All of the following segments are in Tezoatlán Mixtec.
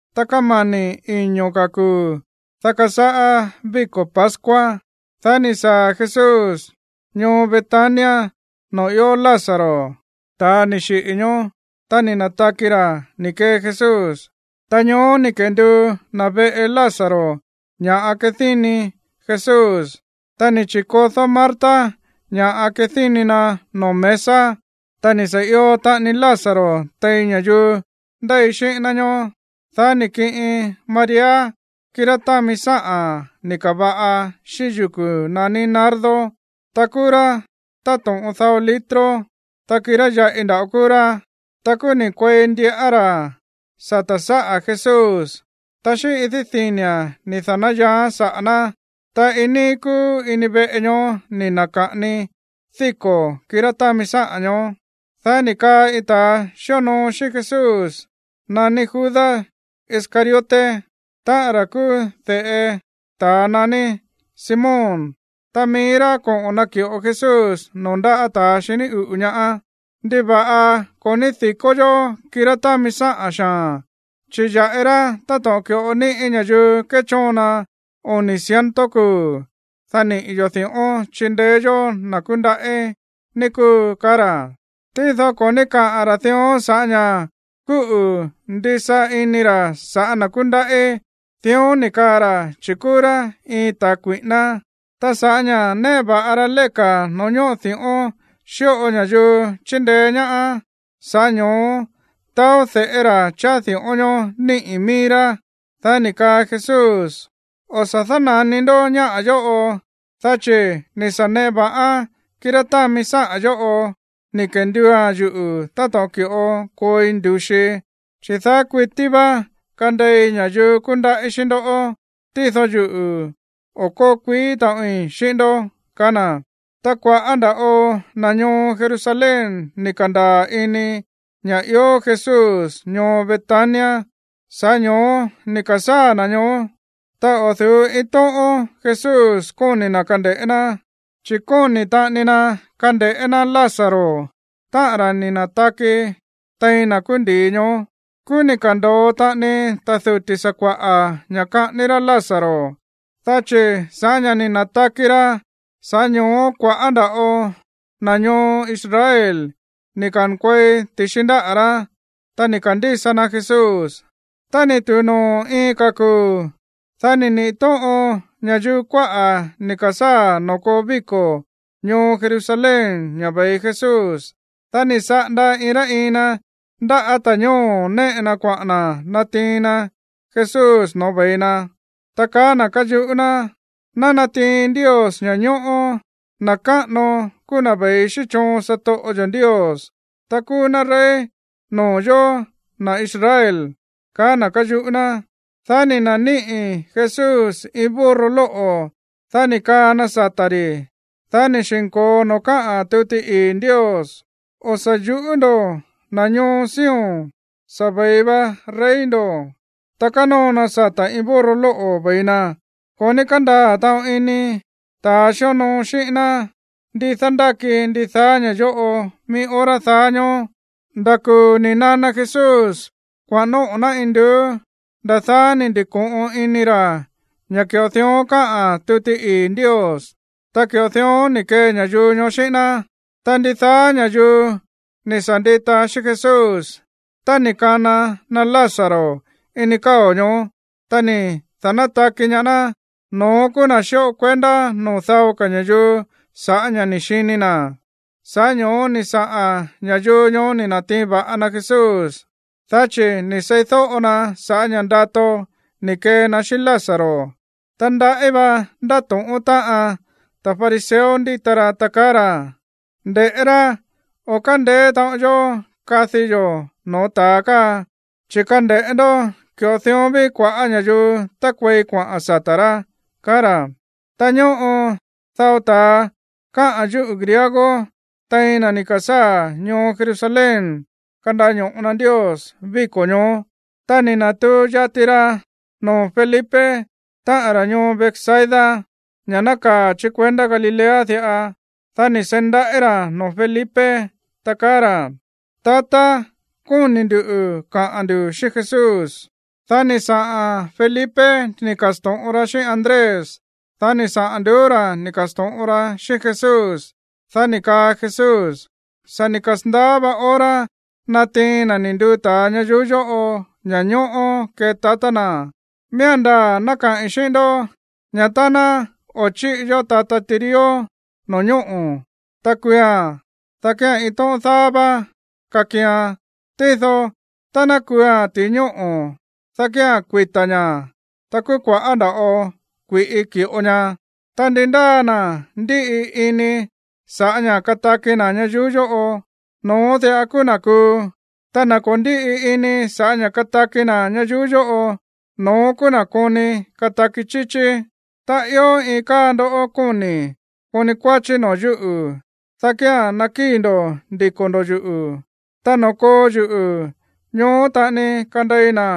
Ta kámani̱ iño̱ ka̱ kuu̱, dá kasáꞌá víko̱ pascua. Dá ni̱ saa̱ Jesús ñoo Betania noo̱ ió Lázaro, ta̱a ni̱ xiꞌi̱ ñoó, ta ni̱ na̱taki ra̱ ni̱ kee Jesús. Ta ñoó ni̱ kenduu na̱ veꞌe Lázaro ña̱ꞌa kadíni Jesús. Ta ni̱ chi̱kodó Marta ña̱ꞌa kadíni na̱ noo̱ mesa. Ta ni̱ sa̱ io taꞌani Lázaro tein ña̱yuu ndéi xíꞌín ná ñoó. Dá ni̱ kiꞌin María kirá támi sáꞌa̱n ni̱ ka̱va̱ꞌa xíꞌín yuku̱ naní nardo, ta kúú rá táto̱ꞌon dao litro, ta kirá yaꞌi nda̱ꞌo kúú rá. Ta kúú ni̱ kuei ndiꞌán ra̱ sata̱ sáꞌa̱ Jesús, ta xíꞌín idí dini̱a̱n ni̱ da̱náyaaán saꞌa̱ ná. Ta iin níí kúú ini veꞌe ñoó ni̱ na̱ka̱ꞌani díko̱ kirá támi sáꞌa̱n ñoó. Dá ni̱ kaa iin ta̱a xíonoo xíꞌín Jesús naní Judas Iscariote, táꞌa̱n ra̱ kúú de̱ꞌe ta̱a naní Simón, ta mií rá koꞌo̱n naki̱ꞌo Jesús noo̱ ndáꞌa̱ ta̱ xiní uꞌu̱ ñaá: ―¿Ndiva̱ꞌa ko̱ ní di̱kó yó kirá támi sáꞌa̱n xaa̱n, chi̱ ya̱ꞌi rá táto̱ꞌon ki̱ꞌo níꞌi̱ ña̱yuu kéchóon na oni̱ ciento kuu̱, dá niꞌi̱ yo̱ di̱ꞌón chindeé yó na̱ kúndaꞌí, ní kúu? ―kaá ra̱. Tído ko̱ ní káꞌa̱n ra̱ dión sa̱ꞌá ña̱ kúꞌu̱ ndisa ini ra̱ sa̱ꞌá na̱ kúndaꞌí. Dión ni̱ kaa ra̱, chi̱ kúú rá iin ta̱ kui̱ꞌíná. Ta sa̱ꞌá ña̱ néꞌe va̱ꞌa ra léka̱ noo̱ ñóꞌo di̱ꞌón xíꞌo ña̱yuu chíndeé ñaá, sa̱ꞌá ño̱ó taó de̱ꞌé ra̱ cháá di̱ꞌón ñoó níꞌi̱ mií rá. Dá ni̱ kaa Jesús: ―O̱ sa̱ dána̱ni ndó ñáꞌa̱ yóꞌo, dá chi̱ ni̱ sa̱ neꞌe va̱ꞌán kirá támi sáꞌa̱n yóꞌo ni̱ kenduua̱n yuꞌu̱ táto̱ꞌon ki̱ꞌo kooi ndu̱xii. Chi̱ daá kuití vá kandei ña̱yuu kúndaꞌí xíꞌín ndó, tído yuꞌu̱, o̱ kóo kuií taꞌoin xíꞌín ndó ―kaá na̱. Ta kua̱ꞌá nda̱ꞌo na̱ ñoo Jerusalén ni̱ ka̱ndaa̱ ini ña̱ ió Jesús ñoo Betania. Sa̱ꞌá ño̱ó ni̱ ka̱sáa̱ na̱ ñoó. Ta o̱ du̱ú iin tóꞌón Jesús kóni̱ na̱ kande̱ꞌé ná, chi̱ kóni̱ taꞌani na kande̱ꞌé ná Lázaro, táꞌa̱n ra̱ ni̱ na̱taki tein na̱ kúú ndi̱i ñoó. Kúú ni̱ ka̱ndo̱o taꞌani ta̱ duti̱ sakua̱ꞌa̱ ña̱ kaꞌání rá Lázaro, dá chi̱ sa̱ꞌá ña̱ ni̱ na̱taki ra̱, sa̱ꞌá ño̱ó kua̱ꞌá nda̱ꞌo na̱ ñoo Israel ni̱ ka̱nkuei ti̱xi ndáꞌa̱ rá, ta ni̱ ka̱ndísa na Jesús. Tá ni̱ tu̱u noo̱ iin ka̱ kuu̱, dá ni̱ niꞌi̱ tóꞌon ña̱yuu kuáꞌa̱ ni̱ ka̱sáa̱ noo̱ koo víko̱ ñoo Jerusalén ña̱ ve̱i Jesús. Dá ni̱ saꞌanda iin rá iin na ndáꞌa̱ ta̱ñóo̱ néꞌe na kuaꞌa̱n na̱ natiin na Jesús noo̱ ve̱i na, ta kaá na̱ káyuꞌú ná: ―¡Ná natiin Ndios ña̱ñóꞌó! ¡Na̱ káꞌano kúú na̱ ve̱i xíꞌín choon satoꞌo yo̱ Ndios! ¡Ta kúú ná rey noo̱ yóó, na̱ Israel! ―kaá na̱ káyuꞌú ná. Dá ni̱ na̱níꞌi̱ Jesús iin burro lóꞌo̱, dá ni̱ kaa na sata̱ ri̱. Dá ni̱ xi̱nko̱o noo̱ káꞌa̱n tuti ii̱ Ndios: O̱ sa̱ yuꞌú ndo̱, na̱ ñoo Sion; sa̱ ve̱i va rey ndo̱, ta kánóo na sata̱ iin burro lóꞌo̱ ve̱i na. Ko̱ ní kándaa̱ taꞌon ini ta̱ xíonoo xíꞌín ná ndi dándáki ndidaá ña̱ yóꞌo mií hora daá ñóó. Nda̱ kuu̱ ni̱ nana Jesús kuaꞌa̱n nóꞌo̱ ná induú, nda̱ daá ni̱ ndi̱ko̱ꞌon ini ra̱ ña̱ ki̱ꞌo dión káꞌa̱n tuti ii̱ Ndios, ta ki̱ꞌo dión ni̱ kee ña̱yuu ñoó xíꞌín ná. Ta ndidaá ña̱yuu ni̱ sa̱ ndita xíꞌín Jesús tá ni̱ kana na Lázaro ini káo̱ ñoó, ta ni̱ da̱nátaki ñaá ná, no̱ón kúú na̱ xíꞌo kuendá noo̱ dao ka̱ ña̱yuu sa̱ꞌá ña̱ ni̱ xini na̱. Sa̱ꞌá ño̱ó ni̱ saꞌa̱n ña̱yuu ñoó ni̱ na̱tiin va̱ꞌa na Jesús, dá chi̱ ni̱ seídóꞌo na sa̱ꞌá ña̱ ndato ni̱ kee na xíꞌín Lázaro. Ta ndaꞌí va ndátóꞌón táꞌan ta̱ fariseo ndíta ra, ta kaá ra̱: ―Nde̱ꞌé rá. O̱ kándeé taꞌon yó kadi yo̱ noo̱ ta̱a káa. Chi̱ kande̱ꞌé ndó, ki̱ꞌo dión ví kua̱ꞌá ña̱yuu tákuei kuaꞌa̱n sata̱ rá ―kaá ra̱. Ta ñóꞌo dao ta̱a káꞌa̱n yúꞌu̱ griego tein na̱ ni̱ ka̱sáa̱ ñoo Jerusalén kandaño̱ꞌo na Ndios víko̱ ñoó. Ta ni̱ na̱tuu yati ra noo̱ Felipe, táꞌan ra̱ ñoo Betsaida, ña̱ nákaa̱ chí kuendá Galilea diꞌa. Dá ni̱ seí ndaꞌí ra̱ noo̱ Felipe, ta kaá ra̱: ―Tatá, kóni̱ ndu̱ kaꞌa̱n ndu̱ xíꞌín Jesús. Dá ni̱ saꞌa̱n Felipe ni̱ ka̱sto̱ꞌon ra xíꞌín Andrés, dá ni̱ saꞌa̱n nduú ra̱ ni̱ ka̱sto̱ꞌon ra xíꞌín Jesús. Dá ni̱ kaa Jesús: ―Sa̱ ni̱ kasa̱ndaá vá hora natiin na̱ ni̱ nduu ta̱a ñayuú yóꞌo ña̱ñóꞌó kee tatá na̱. Miía̱n ndaa̱ ná kaꞌi̱n xíꞌín ndó, ña̱ tá ná o̱ chíꞌi yó tata tirió no̱ñóꞌo̱, ta kuua̱n, dá kía̱n iin tóꞌón dáá vá kakian. Tído tá ná kuua̱n ti̱i ñóꞌo̱, dá kía̱n kuita̱ ña̱, ta kúú kua̱ꞌá nda̱ꞌo kui̱ꞌi ki̱ꞌo ña. Ta ndi ndáa na̱ ndíꞌi ini sa̱ꞌá ña̱ kataki na̱ ñayuú yóꞌo, no̱ón diꞌa kúú na̱ kuu. Ta na̱ ko̱ ndíꞌi ini sa̱ꞌá ña̱ kataki na̱ ñayuú yóꞌo, no̱ón kúú na̱ koni kataki chíchí. Tá ió iin káa ndó kóni̱ koni kuáchí noo̱ yúꞌu̱, dá kía̱n nakíi̱ ndo̱ ndiko̱ ndo̱ yuꞌu̱. Ta noo̱ koo yuꞌu̱, ñoó taꞌani kandei na̱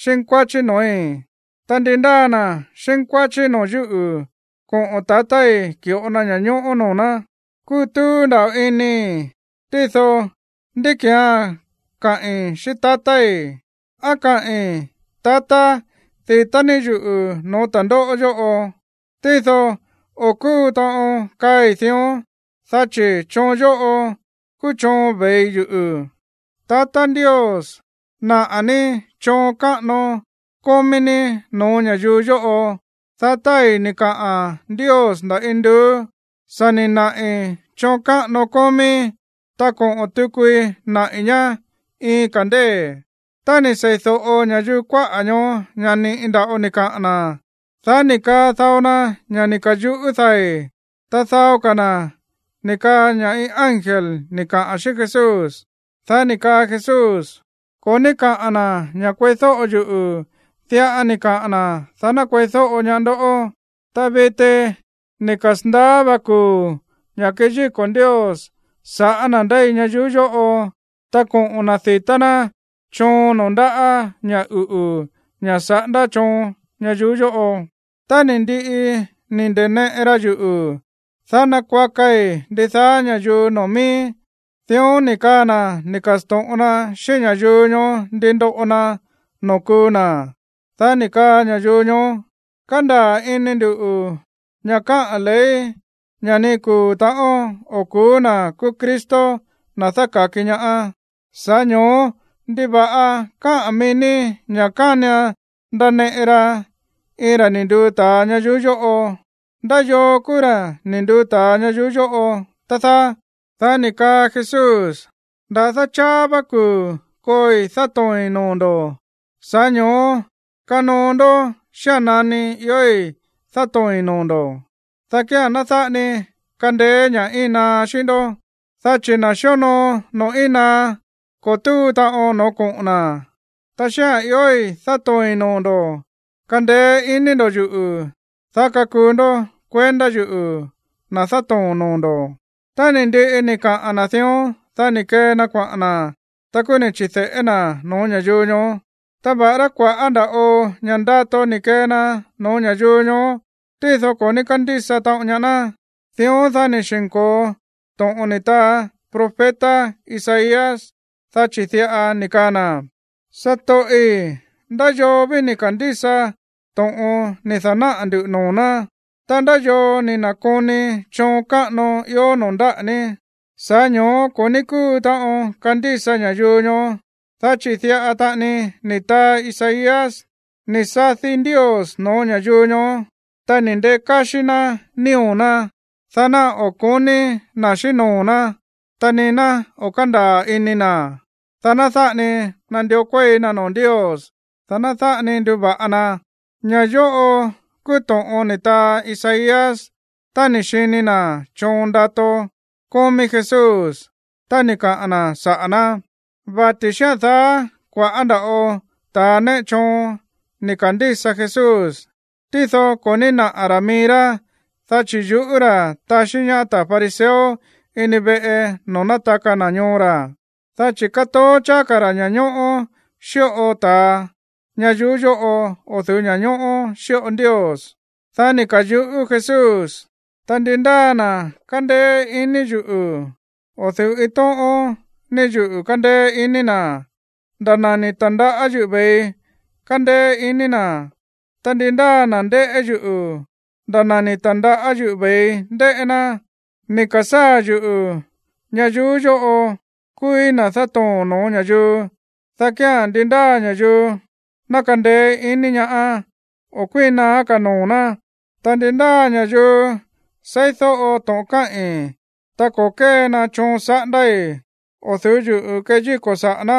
xínkuáchí noo̱í. Ta ndi ndáa na̱ xínkuáchí noo̱ yúꞌu̱, koꞌo̱n tatái̱ ki̱ꞌo na ña̱ñóꞌó noo̱ ná. ’Kútúú nda̱ꞌo inii̱, tído, ¿ndí ki̱án kaꞌi̱n xíꞌín tatái̱? ¿Á kaꞌi̱n: “Tatá, di̱tá ní yuꞌu̱ no̱ó ta̱ndóꞌó yóꞌo”? Tído o̱ kúu taꞌon kaꞌi̱n dión, dá chi̱ choon yóꞌo kúú choon ve̱i yuꞌu̱. Tatá Ndios, naꞌa̱ ní choon káꞌano kómí ní no̱ó ña̱yuu yóꞌo. Dá tái̱ ni̱ kaꞌa̱n Ndios nda̱ induú: ―Sa̱ ni̱ naꞌi̱ choon káꞌano kómíí, ta koꞌo̱n tukui naꞌi̱ ñá iin ka̱ ndée̱. Tá ni̱ seídóꞌo ña̱yuu kuáꞌa̱ ñoó ña̱ ni̱ꞌi nda̱ꞌo ni̱ kaꞌa̱n na̱, dá ni̱ kaa dao na ña̱ ni̱ ka̱yuꞌú dai̱. Ta dao ka̱ na̱ ni̱ kaa ña̱ iin ángel ni̱ kaꞌa̱n xíꞌín Jesús. Dá ni̱ kaa Jesús: ―Ko̱ ní káꞌa̱n na̱ ña̱ kueídóꞌo yuꞌu̱, diꞌa ni̱ kaꞌa̱n na̱, dá ná kueídóꞌo ñaá ndoꞌó. Ta viti ni̱ kasa̱ndaá va kuu̱ ña̱ keyíko̱ Ndios sa̱ꞌá na̱ ndéi ñayuú yóꞌo, ta koꞌo̱n na̱ di̱tá ná choon noo̱ ndáꞌa̱ ña̱ uꞌu̱, ña̱ saꞌándá choon ñayuú yóꞌo. Tá ni̱ ndiꞌi ni̱ nda̱neꞌe ra yuꞌu̱, dá nakuakai ndidaá ña̱yuu noo̱ miíí. Dión ni̱ kaa na̱ ni̱ ka̱sto̱ꞌon na xíꞌín ña̱yuu ñoó ndi ndoꞌo na noo̱ kuu na̱. Dá ni̱ kaa ña̱yuu ñoó: ―Kándaa̱ ini ndu̱ ña̱ káꞌa̱n ley ña̱ ni kuu̱ ta̱ꞌón o̱ ku̱ú na̱ kúú Cristo, na̱ dáka̱ki ñaá. Sa̱ꞌá ño̱ó ¿ndiva̱ꞌa káꞌa̱n mií ní ña̱ kánian ndaneꞌe ra iin ra̱ ni̱ nduu ta̱a ñayuú yóꞌo? ¿Ndá yoo kúú ra̱ ni̱ nduu ta̱a ñayuú yóꞌo, tá dáá? Dá ni̱ kaa Jesús: ―Nda̱dá cháá vá kuu̱ kooi dátoo̱i̱n noo̱ ndo̱. Sa̱ꞌá ño̱ó kanoo ndó xía̱n nani iói̱ dátoo̱i̱n noo̱ ndo̱, dá kíán ná dáꞌa ni kandeé ña̱ íin naá xíꞌín ndó. Dá chi̱ na̱ xíonoo noo̱ íin naá, ko̱ túu taꞌon noo̱ koꞌo̱n na̱. Ta xía̱n iói̱ dátoo̱i̱n noo̱ ndo̱, kandeé iní ndo̱ yuꞌu̱, dá kakuu ndó kuendá yuꞌu̱, na̱ dátoo̱n noo̱ ndo̱. Tá ni̱ ndiꞌi ni̱ kaꞌa̱n na̱ dión, dá ni̱ kee na kuaꞌa̱n na̱, ta kúú ni̱ chi̱de̱ꞌé na̱ no̱ó ña̱yuu ñoó. Ta va̱ꞌará kua̱ꞌá nda̱ꞌo ña̱ ndato ni̱ kee na no̱ó ña̱yuu ñoó, tído ko̱ ní kándísa taꞌon ñaá ná. Dión, dá ni̱ xi̱nko̱o to̱ꞌon ni̱ taa profeta Isaías, dá chi̱ diꞌa ni̱ kaa na̱: Satoꞌi̱, ¿ndá yoo ví ni̱ ka̱ndísa to̱ꞌon ni̱ da̱náꞌa̱ ndu̱ noo̱ ná? Ta, ¿ndá yoo ni̱ na̱koni choon káꞌano ió noo̱ ndáꞌa̱ ní? Sa̱ꞌá ño̱ó ko̱ ní kúu taꞌon kandísa ña̱yuu ñoó, dá chi̱ diꞌa taꞌani ni̱ taa Isaías: Ni̱ sadi Ndios no̱ó ña̱yuu ñoó, ta ni̱ ndekáxí ná nío̱ ná, dá ná o̱ ko̱ní na̱ xíꞌín noo̱ ná, ta ni ná o̱ kándaa̱ ini na̱, dá ná dáꞌa ni nandió kuéi na noo̱ Ndios, ta ná dáꞌa ni nduva̱ꞌa na. Ña̱ yóꞌo kúú to̱ꞌon ni̱ taa Isaías tá ni̱ xini na̱ choon ndato kómí Jesús, ta ni̱ kaꞌa̱n na̱ saꞌa̱ ná. Vati̱ xía̱n daá, kua̱ꞌá nda̱ꞌo ta̱ néꞌe choon ni̱ ka̱ndísa Jesús, tído ko̱ ní náꞌa̱ ra̱ mií rá, dá chi̱ yuꞌú ra̱ taxí ñaá ta̱ fariseo ini veꞌe noo̱ nátaka na̱ ñoo ra̱, dá chi̱ kátoó cháá ka̱ ra̱ ña̱ñóꞌó xíꞌo ta̱a ñayuú yóꞌo o̱ du̱ú ña̱ñóꞌó xíꞌo Ndios. Dá ni̱ ka̱yuꞌú Jesús: ―Tá ndi ndáa na̱ kándéé iní yuꞌu̱, o̱ du̱ú iin tóꞌón ní yuꞌu̱ kándéé iní na̱, nda̱ na̱ ni̱ ta̱ndaꞌá yuꞌu̱ ve̱ii kándéé iní na̱. Ta ndi ndáa na̱ ndéꞌé yuꞌu̱, nda̱ na̱ ni̱ ta̱ndaꞌá yuꞌu̱ ve̱ii ndéꞌé ná. Ni̱ ka̱sáa̱ yuꞌu̱ ñayuú yóꞌo kúúí na̱ dátoo̱n no̱ó ña̱yuu, dá kía̱n ndi ndáa ña̱yuu ná kandeé iní ñaá, o̱ kuíin naá ka̱ noo̱ ná. Ta ndi ndáa ña̱yuu seídóꞌo to̱ꞌon káꞌi̱n, ta ko̱ kée na choon saꞌándái̱, o̱ du̱ú yuꞌu̱ keyíko̱ saꞌa̱ ná,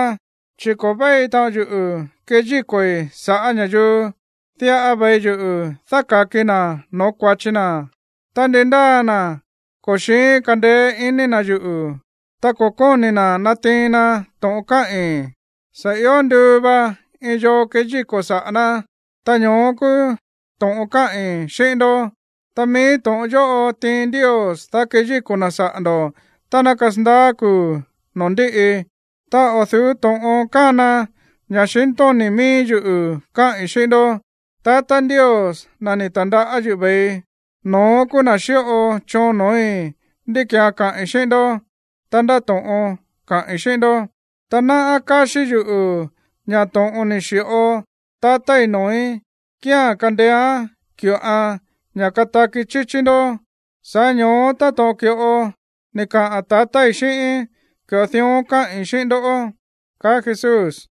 chi̱ ko̱ véi taꞌon yuꞌu̱ keyíko̱i̱ sa̱ꞌá ña̱yuu. Diꞌa ve̱i yuꞌu̱ dáka̱kii na̱ no̱ó kua̱chi na. Ta ndi ndáa na̱ ko̱ xi̱ín kandeé iní na̱ yuꞌu̱, ta ko̱ kóni̱ na̱ natiin na to̱ꞌon káꞌi̱n, sa̱ io nduu va iin yoo keyíko̱ saꞌa̱ ná. Ta ño̱ó kúú to̱ꞌon káꞌi̱n xíꞌín ndó. Ta mií to̱ꞌon yóꞌo tiin Ndios, dá keyíko̱ na̱ saꞌa̱ ndo̱ tá ná kasandaá kuu̱ noo̱ ndíꞌi. Ta o̱ du̱ú to̱ꞌon kána ña̱xintóni̱ mií yuꞌu̱ káꞌi̱n xíꞌín ndó. Tatá Ndios, na̱ ni̱ ta̱ndaꞌá yuꞌu̱ ve̱ii, no̱ón kúú na̱ ni̱ xi̱ꞌo choon no̱ói̱ ndi kía̱n kaꞌi̱n xíꞌín ndó, ta ndá to̱ꞌon kaꞌi̱n xíꞌín ndó. Ta náꞌá káxí yuꞌu̱ ña̱ to̱ꞌon ni̱ xi̱ꞌo tatái̱ noo̱í kía̱n kandeéán ki̱ꞌoan ña̱ kataki chíchí ndó. Sa̱ꞌá ño̱ó, táto̱ꞌon ki̱ꞌo ni̱ kaꞌa̱n tatái̱ xíꞌíín, ki̱ꞌo dión káꞌi̱n xíꞌín ndó ―kaá Jesús.